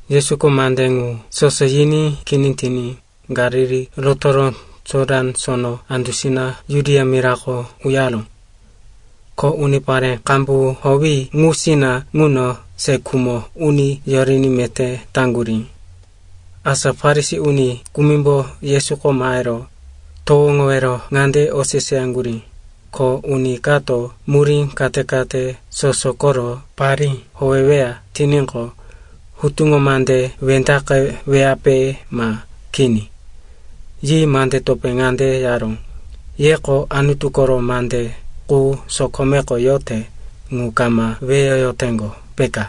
Yesuko mande ŋu soso yiní kini tiní Galili rotoro Jotan Sono andusina Judia mirako uyaró. Ko unipare qambu howi ŋusina ŋuno se khumo uni yoriní meté taŋgurí. Asa Farisi uni kumimbo Yesuko mahero towoŋowero ŋande oseseyaŋgurí, “Ko uni kato murí kate-kate soso koro parí howeweya tiníqo, hutuŋo mande wendaqeweyape ma kini?” Yi mande topé ŋande yaró, “Yeko Anutu koro mande qu sokomeko yote ŋu kama weyoyoteŋgo, peka?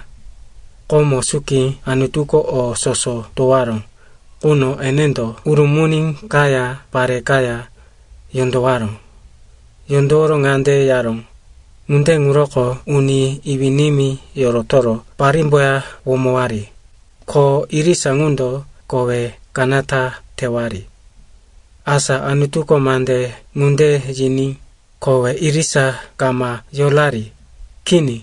Komo suki Anutuko o soso towaró quno enendo ‘urumuni kaya, pare kaya yondowaró.’ Yondoworo ŋande yaró, ‘Ŋunde ŋuroko uni iwí-nimí yorotoro parímboya womowari, ko irisa ŋundo kowe kanata tewari.’ Asa Anutuko mande ŋunde yiní kowe irisa kama yorari. Kini.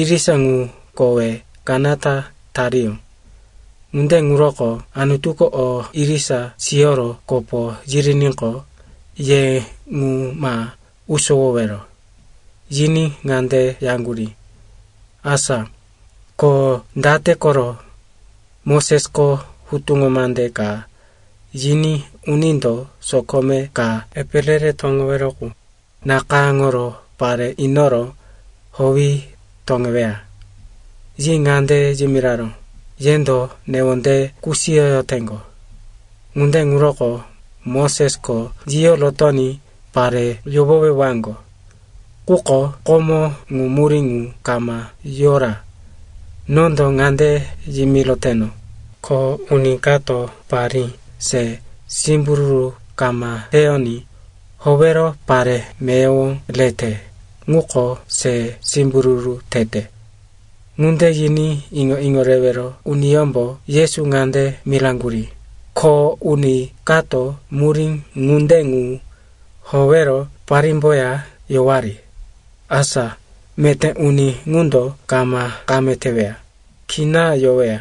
Irisa ŋu kowe kanata tariyó. Ŋunde ŋuroko Anutuko o irisa siyoro kopo yiriníqo, ye ŋu ma usowowero.” Yiní ŋande yaŋgurí, “Asa ko date koro Mosesko hutuŋo mande ka yiní unindo sokome ka epe re-re toŋowero qu nakayáŋoro pare inoro howi toŋeweya?” Yi ŋande yimiraró, “Yendo newondeye kusiyoyoteŋgo, ŋunde ŋuroko Mosesko yiyo rotoní pare yohowewaŋgo. Quko komo ŋu murí ŋu kama yora. Nondo ŋande yimiroteno, ko uni kato parí se simbururu kama teyoní howero pare meyowo rete ŋuko se simbururu tete.” Ŋunde yiní iŋo-iŋo rewero uniyómbo Yesu ŋande miraŋgurí, “Ko uni kato murí ŋunde ŋu howero parímboya yowari, asa meté uni ŋundo kama kame teweya, kina yoweya.”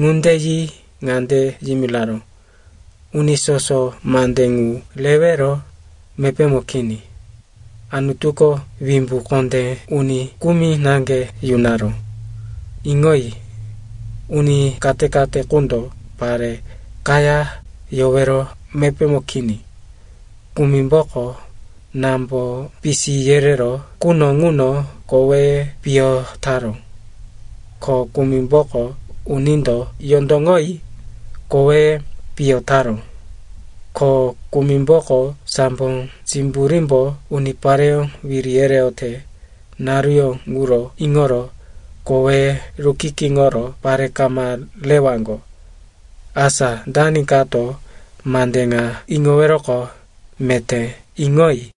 Ŋunde yi ŋande yimiraró, “Uni soso mande ŋu rewero mepémo kini. Anutuko wimbu kondé uni kumi naŋge yunaró. Iŋoyi. Uni kate-kate qundo pare kaya yowero mepémo kini. Kumimboko námbo pisi yereró quno ŋuno koweye piyo taró. Ko kumimboko unindo yondoŋoyi koweye piyo taró. Ko kumimboko sambo simburímbo unipareyó wiri yereyote naruyó ŋuro iŋoro koweye rukikiŋoro pare kama rewaŋgo. Asa dani kato mande ŋa iŋoweroqo, meté iŋoyi.”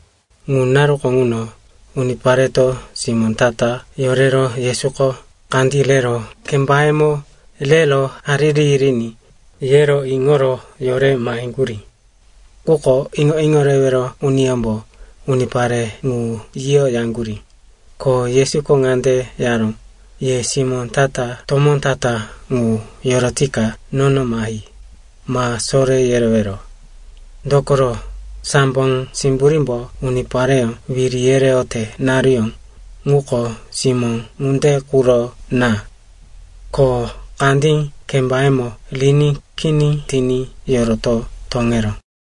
Ŋu naruko ŋuno unipareto simó ta-ta yorero, Yesuko kandí rero kembayemo rero hariri yiriní, yero iŋoro yore maheŋgurí. Quko iŋo-iŋo rewero uniyómbo unipare ŋu yiyo yaŋgurí. Ko Yesuko ŋande yaró, “Ye simó ta-ta tomó ta-ta ŋu yorotika nono mahi, ma soré yerewero. Dokoro sambo simburímbo unipareyó wiri yereyote naruyó ŋuko simó ŋunde quro na.” Ko kandí kembayemo riní kini tiní yoroto toŋeró.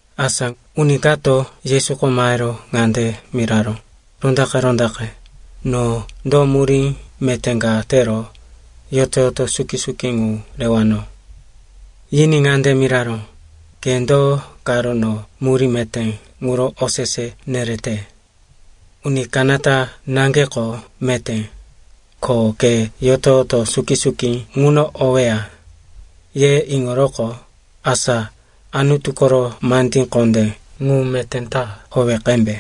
Asa uni kato Yesuko mahero ŋande miraró, “Rondaqe-rondaqe, no do murí meté ka tero yoto-yoto suki-suki ŋu rewano?” Yiní ŋande miraró, “Ke do karo no murí meté ŋuro osese nerete? Uni kanata naŋgeko meté. Ko ke yoto-yoto suki-suki ŋuno oweya, ye iŋoroqo, asa Anutu koro mande kondé ŋu meté ta howe qembe.”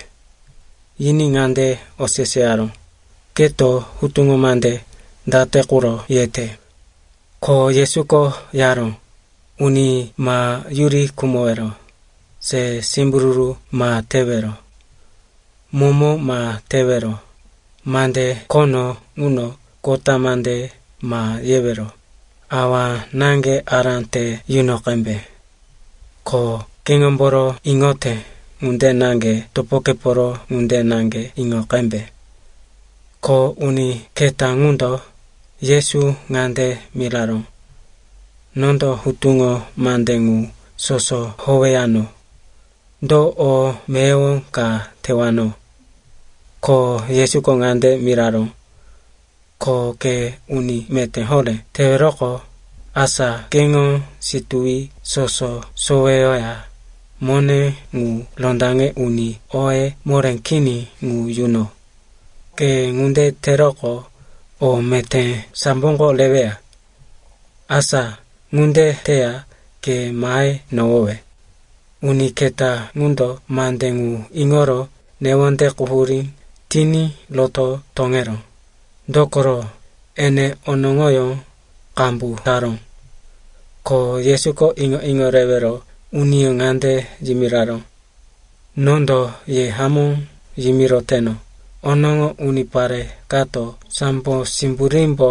Yiní ŋande oseseyaró, “Keto hutuŋo mande date quro yete?” Ko Yesuko yaró, “Uni ma yuri khumowero, se simbururu ma tewero, momo ma tewero, mande khono ŋuno kota mande ma yewero, awa-náŋge ará te yuno qembe. Ko keŋomboro iŋoyote ŋunde naŋge topokeporo ŋunde naŋge iŋo qembe.” Ko uni keta ŋundo Yesu ŋande miraró, “Nondo hutuŋo mande ŋu soso howeyano. Do o meyowo ka tewano?” Ko Yesuko ŋande miraró, “Ko ke uni meté horé teweroqo, asa keŋo situwi soso soweyoya mone ŋu rondaŋe uni oye moré kini ŋu yuno. Ke ŋunde teroqo, o meté samboko reweya. Asa ŋunde teya ke mahe nohowe.” Uni keta ŋundo mande ŋu iŋoro newonde quhurí tiní roto toŋeró, dokoro, ene onoŋoyó qambu taró. Ko Yesuko iŋo-iŋo rewero uniyó ŋande yimiraró, “Nondo ye hamó yimiroteno, onoŋo unipare kato sambo simburímbo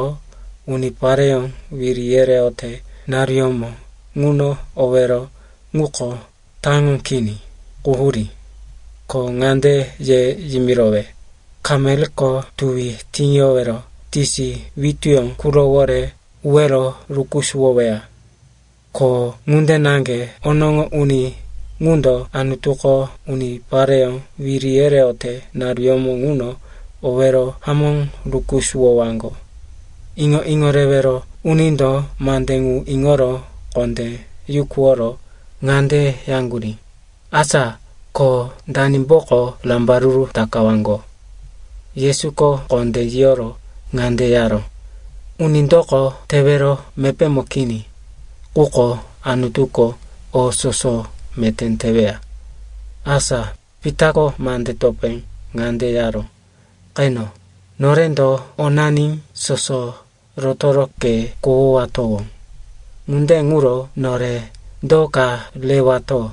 unipareyó wiri yereyote naruyómo ŋuno owero ŋuko taŋo kini, quhurí. Ko ŋande ye yimirowe, kamelko tuwi tiŋiyowero tisi wituyó qurowore uwero rukusuwoweya. Ko ŋunde naŋge onoŋo uni ŋundo Anutuko unipareyó wiri yereyote naruyómo ŋuno owero hamó rukusuwowaŋgo.” Iŋo-iŋo rewero unindo mande ŋu iŋoro kondé yukuworo ŋande yaŋgurí, “Asa ko danimboko rambaruru takawaŋgo?” Yesuko kondé yiyoro ŋande yaró, “Unindoko tewero mepémo kini. Quko Anutuko o soso meté teweya.” Asa Pitako mande topé ŋande yaró, “Qeno, norendo onani soso rotoro ke kohowatowó. Ŋunde ŋuro nore do ka rewato?”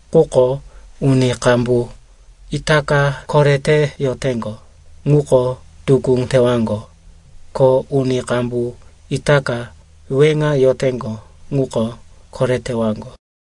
Quko uni qambu itaka korete yoteŋgo, ŋuko tukú tewaŋgo. Ko uni qambu itaka weŋa yoteŋgo, ŋuko koretewaŋgo.